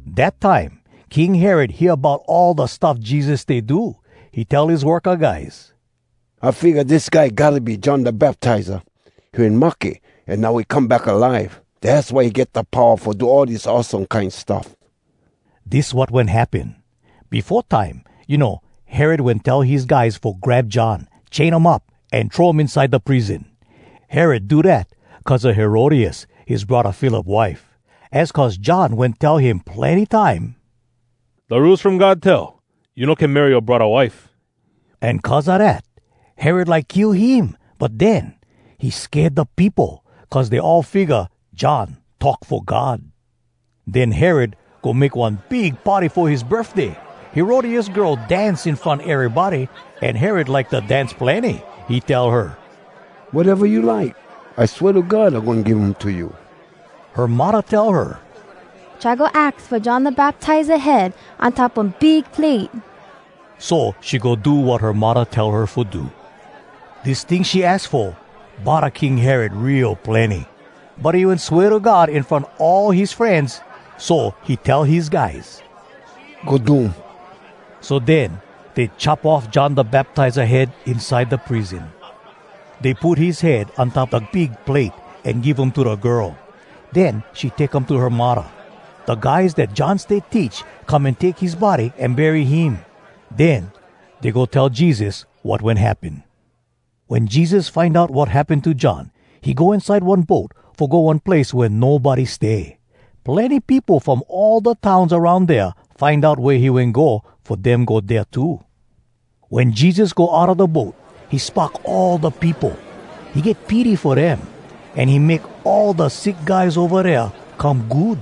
Dat time, King Herod hear bout all da stuff Jesus stay do. He tell his worka guys, “I figga, dis guy gotta be John Da Baptiza. He wen mahke, an now he come back alive. Dass why he get da powa fo do all dis awesome kine stuff.” Dis wat wen happen. Befo time, you know, Herod wen tell his guys fo grab John, chain um up, an throw um inside da prison. Herod do dat cuz a Herodias, his braddah Philip wife. Az cuz John wen tell him plenny time, “Da Rules From God tell, ‘You no can marry yoa braddah wife.’” An cuz a dat, Herod like kill him, but den, he sked da peopo, cuz dey all figga John talk fo God. Den Herod go make one big party fo his birfday. Herodias girl dance in front erybody, an Herod like da dance plenny. He tell her, “Wateva you like, I swea to God I goin give um to you.” Her muddah tell her, “Try go aks fo John Da Baptiza head on top one big plate!” So she go do wat her muddah tell her fo do. Dis ting she aks fo bodda King Herod real plenny. But he wen swea to God in front all his frenz, so he tell his guys, “Go do um.” So den dey chop off John Da Baptiza head inside da prison. Dey put his head on top da big plate, an give um to da girl. Den she take um to her muddah. Da guys dat John stay teach come an take his body an bury him. Den dey go tell Jesus wat wen happen. Wen Jesus find out wat happen to John, he go inside one boat fo go one place wea nobody stay. Plenny peopo from all da towns aroun dea find out wea he wen go fo dem go dea too. Wen Jesus go outa da boat, he spock all da peopo. He get pity fo dem, an he make all da sick guys ova dea come good.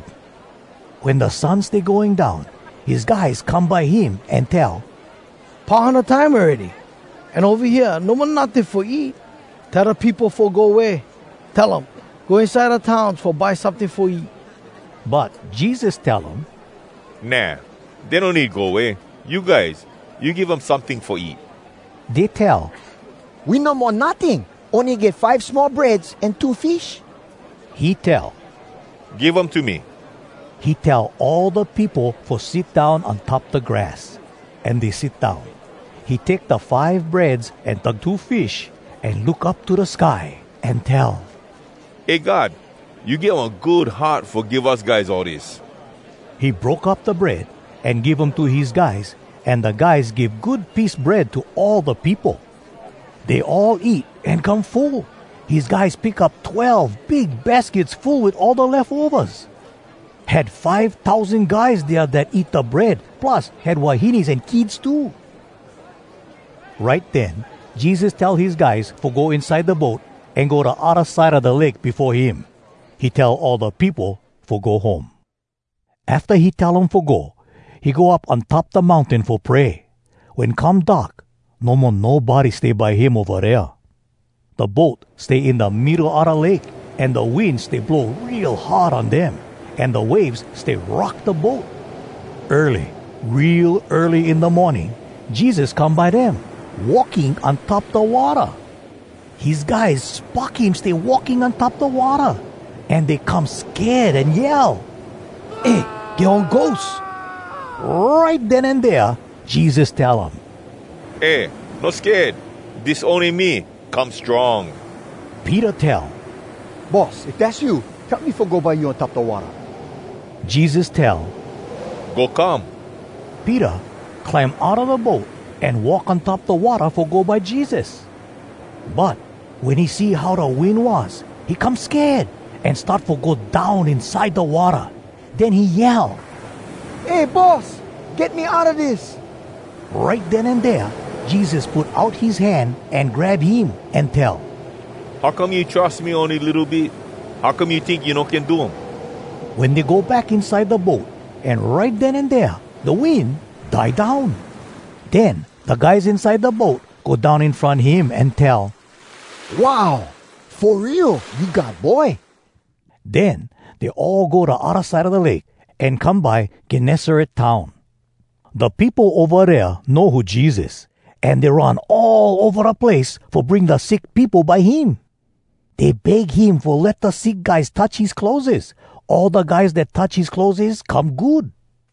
Wen da sun stay going down, his guys come by him an tell, “Pau hana time awready! An ova hea no mo notting fo eat. Tell da peopo fo go way: Tell um, ‘Go inside da towns fo buy someting fo eat!’” But Jesus tell um, “Nah! Dey no need go way. You guys, you give um someting fo eat.” Dey tell, “We no mo notting. Ony get five small breads an two fish.” He tell, “Give um to me.” He tell all da peopo fo sit down on top da grass. An dey sit down. He take da five breads an da two fish, an look up to da sky, an tell, “Eh God! You get one good heart fo give us guys all dis!” He broke up da bread, an give um to his guys, an da guys give good piece bread to all da peopo. Dey all eat an come full. His guys pick up twelve big baskets full wit all da lefovas. Had five tousan guys dea dat eat da bread, plus had wahines an kids too. Right den Jesus tell his guys fo go inside da boat, an go da odda side a da lake befo him. He tell all da peopo fo go home. Afta he tell um fo go, he go up on top da mountain fo pray. Wen come dark, no mo nobody stay by him ova dea. Da boat stay in da middo a da lake, an da wind stay blow real hard on dem, an da waves stay rock da boat. Early, real early in da morning, Jesus come by dem, walking on top da watta. His guys spock him stay walking on top da watta, an dey come sked an yell, “Eh, get one ghost!” Right den an dea Jesus tell um, “Eh, no sked. Dis ony me! Come strong!” Peter tell, “Boss, if dass you, tell me fo go by you on top da watta.” Jesus tell, “Go come.” Peter climb outa da boat, an walk on top da watta fo go by Jesus. But wen he see how da wind was, he come sked, an start fo go down inside da watta. Den he yell, “Eh, Boss! Get me outa dis!” Right den an dea Jesus put out his hand an grab him, an tell, “How come you trus me ony litto bit? How come you tink you no can do um?” Wen dey go back inside da boat, an right den an dea, da wind die down. Den da guys inside da boat go down in front him, an tell, “Wow! Fo real, you God Boy!” Den dey all go da odda side a da lake, an come by Gennesaret town. Da peopo ova dea know who Jesus, an dey run all ova da place fo bring da sick peopo by him. Dey beg him fo let da sick guys touch his clotheses. All da guys dat touch his clotheses come good.